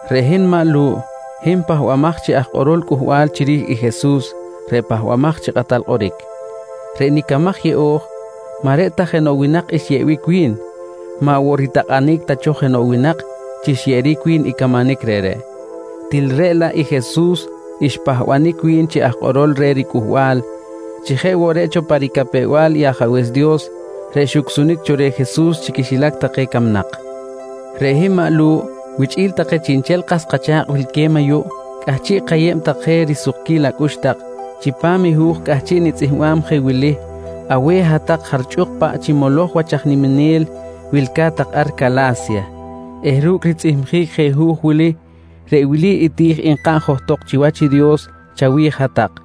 Reꞌ hin maꞌ Lu̱ꞌ, hin pahbamaj chi aj kꞌorol cꞌuhbal chiri̱j i Jesus reꞌ Pahbamaj chi Kꞌatal Kꞌoric. Reꞌ nicamaj yeꞌo̱j maꞌ reꞌ ta jenoꞌ winak xyeꞌbic wi̱n, maꞌ woꞌ ritakꞌanic ta cho jenoꞌ winak chi xyeꞌeric wi̱n i camanic reꞌreꞌ, til reꞌ laꞌ i Jesus xpahbanic wi̱n chi aj kꞌorol reh riCꞌuhbal chi jeꞌ woꞌ reꞌ cho pa ricapew-bal i Ajabe̱s Dios reꞌ xucsunic cho reh Jesus chi quixilac take camnak. Reꞌ hin maꞌ Lu̱ꞌ wichꞌi̱l take chiꞌnchel kas kacha̱kꞌ wilque̱b ayuꞌ cꞌahchiꞌ kayeb tak je risukquil acꞌux tak chipam i hu̱j cꞌahchiꞌ nitzꞌihmbam je wili aweh hat-tak jarchꞌuk paꞌ chi moloj wach aj niminel wilca̱t tak ar Cala̱sya eh ru̱cꞌ ritzꞌihmjic je hu̱j wili, reꞌ wili i ti̱j nkaꞌn johtok chiwach i Dios chawi̱j hat-tak: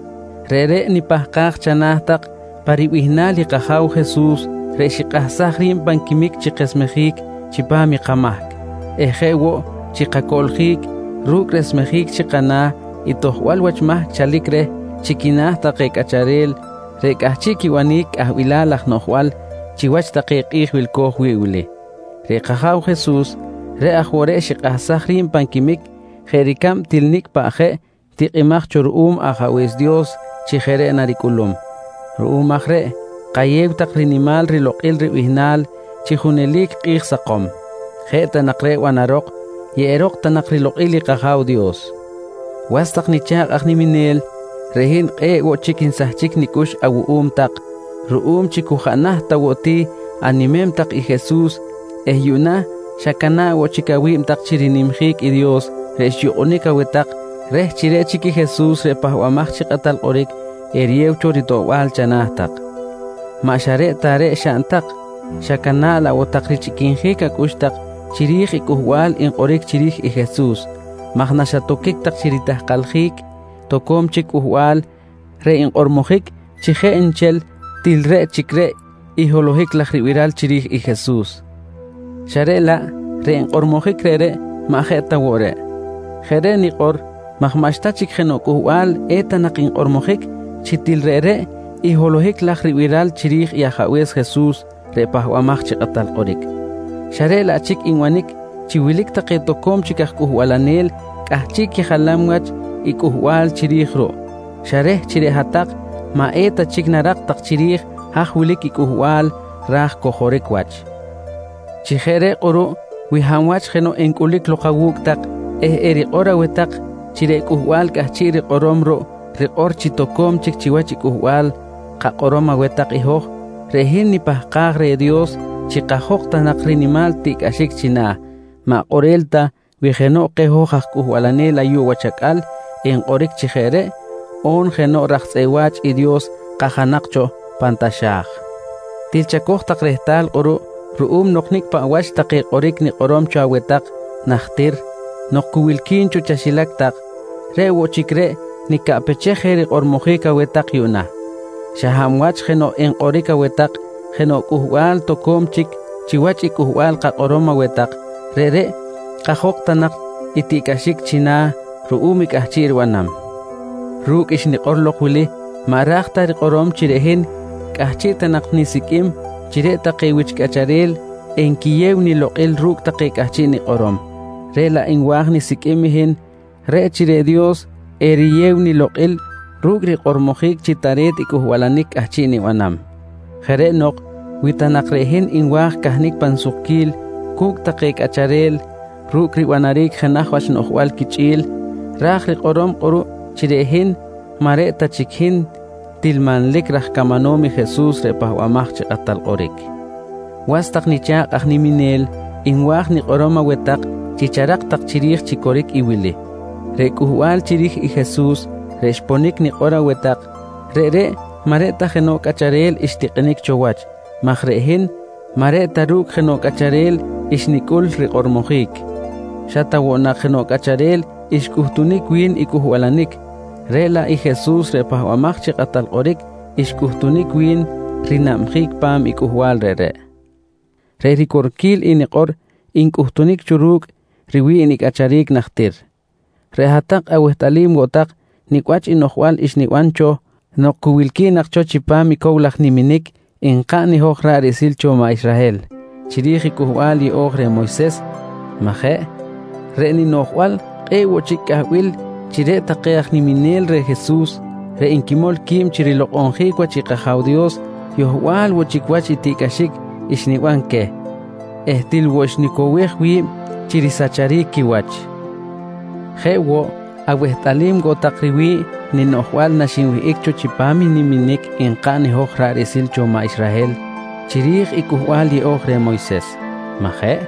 Reꞌreꞌ nipahkaj chana̱ tak pa ribihnal i kAja̱w Jesus reꞌ xikꞌahsaj ri̱b pan quimic chi kesmejic chipam i kamahc eh jeꞌ woꞌ chi kacoꞌljic ru̱cꞌ resmejic chi kana̱ i tojbal wach mahc chalic reh chi quina̱ take cꞌacharel reꞌ cꞌahchiꞌ quibanic cꞌahbilal laj noꞌjbal chiwach take kꞌi̱j wilco̱j wi̱ꞌ wili. Reꞌ kAja̱w Jesus, reꞌ aj woꞌ reꞌ xikꞌahsaj ri̱b pan quimic jeꞌ ricab til nicꞌ paꞌ jeꞌ tikꞌimaj cho ruꞌum Ajabe̱s Dios chi jeꞌ reꞌ naricꞌulum. Ruꞌum aj reꞌ kayew tak rinimal rilokꞌil ribihnal chi junelic kꞌi̱j sakom! Jeꞌ ta nak reꞌ banarok, yeꞌerok ta nak rilokꞌil i kAja̱w Dios. Was tak nicha̱kꞌ aj niminel, reꞌ hin kꞌe̱ꞌ woꞌ chic nsahchic nicꞌux awuꞌum tak ruꞌum chi cu jaꞌ naht ta woꞌ ti animem tak i Jesus eh yuꞌna xacana̱ꞌ woꞌ chic awi̱b tak chi rinimjic i Dios reꞌ xyukꞌunic aweh tak reh chi reꞌ chic i Jesus reꞌ Pahbamaj chi Kꞌatal Kꞌoric eriyew cho ritoꞌbal chana̱ tak. Maꞌ xa reꞌ ta reꞌ xaꞌn tak, xacana̱ꞌ laꞌ woꞌ tak richꞌiquinjic acꞌux tak chiri̱j i cꞌuhbal nkꞌoric chiri̱j i Jesus maj xatoquic tak chi ritahkaljic toco̱m chic cꞌuhbal reꞌ nkꞌormojic chi jeꞌ nchel til reꞌ chic reꞌ i holohic laj ribiral chiri̱j i Jesus, xa reꞌ laꞌ reꞌ nkꞌormojic reꞌreꞌ maꞌ jeꞌ ta woꞌ reꞌ. Jeꞌ reꞌ nikꞌor maj maꞌxta chic jenoꞌ cꞌuhbal eta nak nkꞌormojic chi til reꞌreꞌ i holohic laj ribiral chiri̱j i Ajabe̱s Jesus reꞌ Pahbamaj chi Kꞌatal Kꞌoric, xa reꞌ laꞌ chic nbanic chi wilic take toco̱m chic aj cꞌuhbalanel cꞌahchiꞌ quijalam wach i cꞌuhbal chiri̱j ruꞌ xa reh chi reꞌ hat-tak maꞌ eta chic narak tak chiri̱j haj wilic i cꞌuhbal ra̱j cojoric wach. Chi jeꞌ reꞌ kꞌuruꞌ wi hab wach jenoꞌ encꞌulic lok awu̱cꞌ tak eh erikꞌor aweh tak chi reꞌ cꞌuhbal cꞌahchiꞌ rikꞌorom ruꞌ rikꞌor chi toco̱m chic chiwach i cꞌuhbal kakꞌorom aweh tak i hoj, reꞌ hin nipahkaj reh Dios chi kajok ta nak rinimal tiꞌcꞌaxic china̱, maꞌ kꞌorel ta wi jenoꞌ keh hoj aj cꞌuhbalanel ayuꞌ wach acꞌal enkꞌoric chi jeꞌ reꞌ on jenoꞌ raj tzꞌeꞌ wa̱ch i Dios kajanak cho pan taxa̱j. Til chacoj tak rehtal kꞌuruꞌ ruꞌum nok nicꞌ paꞌ wach take kꞌoric nikꞌorom cho aweh tak najtir nok cu wilqui̱n cho chaxilac tak, reꞌ woꞌ chic reꞌ nicaꞌpechej je rikꞌormojic aweh tak yuꞌna: Xa hab wach jenoꞌ enkꞌoric aweh tak jenoꞌ cꞌuhbal toco̱m chic chiwach i cꞌuhbal kakꞌorom aweh tak, reꞌreꞌ kajok ta nak i tiꞌcꞌaxic china̱ ruꞌum i cꞌahchiꞌ ribanam. Ru̱cꞌ xnikꞌor lok wili maꞌ ra̱j ta rikꞌorom chi reꞌ hin cꞌahchiꞌ ta nak nisiqꞌuim chi reꞌ take wich cꞌacharel enquiyew nilokꞌil ru̱cꞌ take cꞌahchiꞌ nikꞌorom, reꞌ laꞌ nwa̱j nisiqꞌuim i hin reꞌ chi reꞌ Dios eriyew nilokꞌil ru̱cꞌ rikꞌormojic chi tare̱t i cꞌuhbalanic cꞌahchiꞌ nibanam. Jeꞌ reꞌ nok wi ta nak reꞌ hin nwa̱j cahnic pan sukquil cu̱cꞌ take cꞌacharel ru̱cꞌ ribanaric jenaj wach ninoꞌjbal quichꞌi̱l, ra̱j rikꞌorom kꞌuruꞌ chi reꞌ hin maꞌ reꞌ ta chic hin til manlic raj camanom i Jesus reꞌ Pahbamaj chi Kꞌatal Kꞌoric. Was tak nicha̱kꞌ aj niminel, nwa̱j nikꞌorom aweh tak chi charak tak chiri̱j chi coric i wili: Reꞌ cꞌuhbal chiri̱j i Jesus reꞌ xponic nikꞌor aweh tak, reꞌreꞌ maꞌ reꞌ ta jenoꞌ cꞌacharel xtikꞌinic cho wach maj reꞌ hin maꞌ reꞌ ta ru̱cꞌ jenoꞌ cꞌacharel xnicꞌul rikꞌormojic. Xa ta woꞌ nak jenoꞌ cꞌacharel xcꞌuhtunic wi̱n i cꞌuhbalanic, reꞌ laꞌ Jesus reꞌ Pahbamaj chi Kꞌatal Kꞌoric xcꞌuhtunic wi̱n rinabjic pa̱m i cꞌuhbal reꞌreꞌ. Reꞌ ricorquil i nikꞌor ncꞌuhtunic cho ru̱cꞌ riwi̱ꞌ nicꞌacharic najtir. Reꞌ hat-tak awehtꞌalim woꞌ tak nicꞌ wach i noꞌjbal xniban cho nok cu wilqui̱n cho nak chipam i cow laj niminic nkaꞌn i hoj ra̱ꞌ riꞌsil cho maꞌ Israhel chiri̱j i Cꞌuhbal Yeꞌo̱j reh Moyses, maꞌ jeꞌ? Reꞌ ninoꞌjbal kꞌe̱ꞌ woꞌ chic cꞌahbil chi reꞌ take aj niminel reh Jesus reꞌ nquimol qui̱b chi rilokꞌonjic wach i kAja̱w Dios yohbal woꞌ chic wach i tiꞌcꞌaxic xniban queh eh til woꞌ xnicowej wi̱b chi risacharic quiwach. Jeꞌ woꞌ awehtꞌalim woꞌ tak riwi̱ꞌ ninoꞌjbal naxinwihꞌic cho chipam i niminic nkaꞌn i hoj ra̱ꞌ riꞌsil cho maꞌ Israhel chiri̱j i Cꞌuhbal Yeꞌo̱j reh Moyses, maꞌ jeꞌ?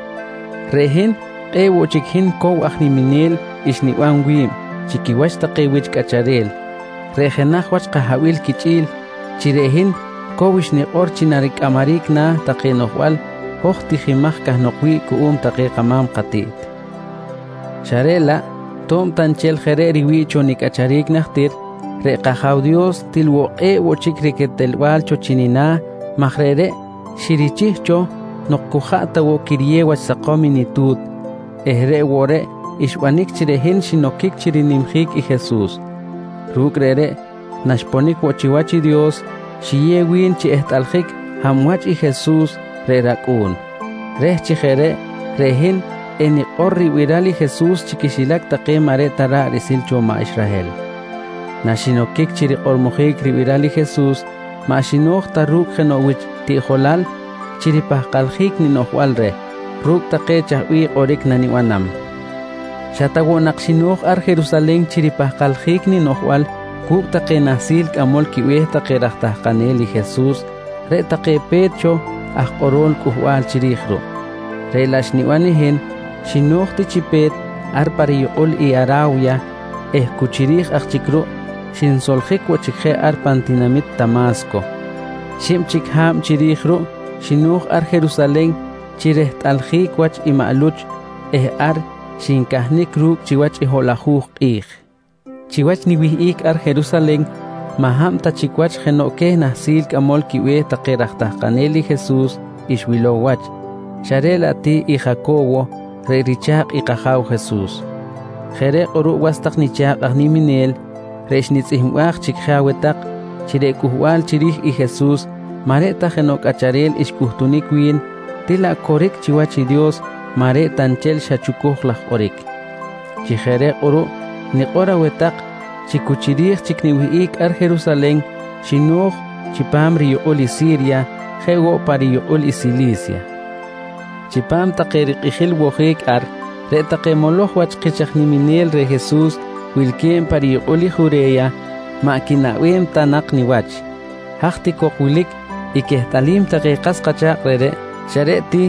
Reꞌ hin kꞌe̱ꞌ woꞌ chic hin cow aj niminel xniban wi̱b chi quiwach take wich cꞌacharel reꞌ jenaj wach kahabil quichꞌi̱l chi reꞌ hin cow xnikꞌor chi naricꞌamaric na̱ take noꞌjbal hoj tijimaj cahnok wi̱ꞌ cuꞌum take kama̱m katiꞌt. Xa reꞌ laꞌ to̱b ta nchel jeꞌ reꞌ riwi̱ꞌ cho nicꞌacharic najtir, reꞌ kAja̱w Dios til woꞌ kꞌe̱ꞌ woꞌ chic riquetelbal cho chi nina̱ maj reꞌreꞌ xirichih cho nok cu jaꞌ ta woꞌ quiriyew wach sakom i nitu̱t eh reꞌ woꞌ reꞌ xbanic chi reꞌ hin xinoquic chi rinimjic i Jesus. Ru̱cꞌ reꞌreꞌ naxponic woꞌ chiwach i Dios, xiyew wi̱n chi ehtꞌaljic hab wach i Jesus reꞌ rAcꞌu̱n, reh chi jeꞌ reꞌ, reꞌ hin enikꞌor ribiral i Jesus chi quixilac take maꞌ reꞌ ta ra̱ꞌ riꞌsil cho maꞌ Israhel. Naxinoquic chi rikꞌormojic ribiral i Jesus, maꞌ xino̱j ta ru̱cꞌ jenoꞌ wich tiꞌjolal chi ripahkaljic ninoꞌjbal reh ru̱cꞌ take chaj bih kꞌoric nanibanam. Xa ta woꞌ nak xino̱j ar Jerusalen chi ripahkaljic ninoꞌjbal cu̱cꞌ take nahsil cꞌamol quibe̱h take raj tahkanel i Jesus reꞌ take pe̱t cho aj kꞌorol cꞌuhbal chiri̱j ruꞌ, reꞌ laꞌ xniban i hin xino̱j ti chi pe̱t ar pa riyukꞌul i Ara̱wya eh cu chiri̱j aj chic ruꞌ xinsoljic woꞌ chic je ar pan tinamit Tama̱sco. Xib chic ha̱b chiri̱j ruꞌ, xino̱j ar Jerusalen chi rehtꞌaljic wach i maꞌ Luch eh ar xincahnic ru̱cꞌ chiwach hoꞌlajuj kꞌi̱j. Chiwach niwihꞌic ar Jerusalen maꞌ hab ta chic jenoꞌ queh nahsil cꞌamol quibe̱h take raj tahkanel i Jesus xwilow wach, xa reꞌ laꞌ ti i Jaco̱wo reꞌ richa̱kꞌ i kAja̱w Jesus. Jeꞌ reꞌ kꞌuruꞌ was tak nicha̱kꞌ aj niminel, reꞌ xnitzꞌihmbaj chic je aweh tak chi reꞌ cꞌuhbal chiri̱j i Jesus maꞌ reꞌ ta jenoꞌ cꞌacharel xcꞌuhtunic wi̱n, til laꞌ coric chiwach i Dios maꞌ reꞌ ta nchel xa chucuj laj kꞌoric. Chi jeꞌ reꞌ kꞌuruꞌ nikꞌor aweh tak chi cu chiri̱j chic niwihꞌic ar Jerusalen xino̱j chipam riyukꞌul i Si̱rya jeꞌ woꞌ pa riyukꞌul i Sili̱sya. Chipam take rikꞌijil wojic ar, reꞌ take moloj wach kich aj niminel reh Jesus wilque̱b pa riyukꞌul i Jure̱ya, maꞌ quinaꞌbem ta nak niwach. Haj ti cok wilic i quehtꞌalim take kas kacha̱kꞌ reꞌreꞌ, xa reꞌ ti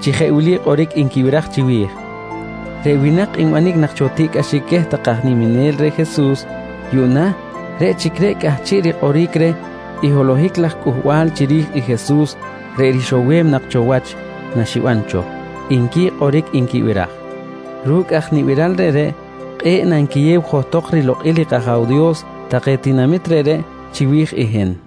chi jeꞌ wili kꞌoric nquibiraj chiwi̱j: «Reꞌ winak nbanic nak cho tiꞌcꞌaxic queh take aj niminel reh Jesus, yuꞌna reꞌ chic reꞌ cꞌahchiꞌ rikꞌoric reh i holohic laj cꞌuhbal chiri̱j i Jesus reꞌ rixowem nak cho wach naxiban cho, nqui kꞌoric nquibiraj. Ru̱cꞌ aj nibiral reꞌreꞌ, kꞌe̱ꞌ nanquiyew johtok rilokꞌil i kAja̱w Dios take tinamit reꞌreꞌ chiwi̱j i hin.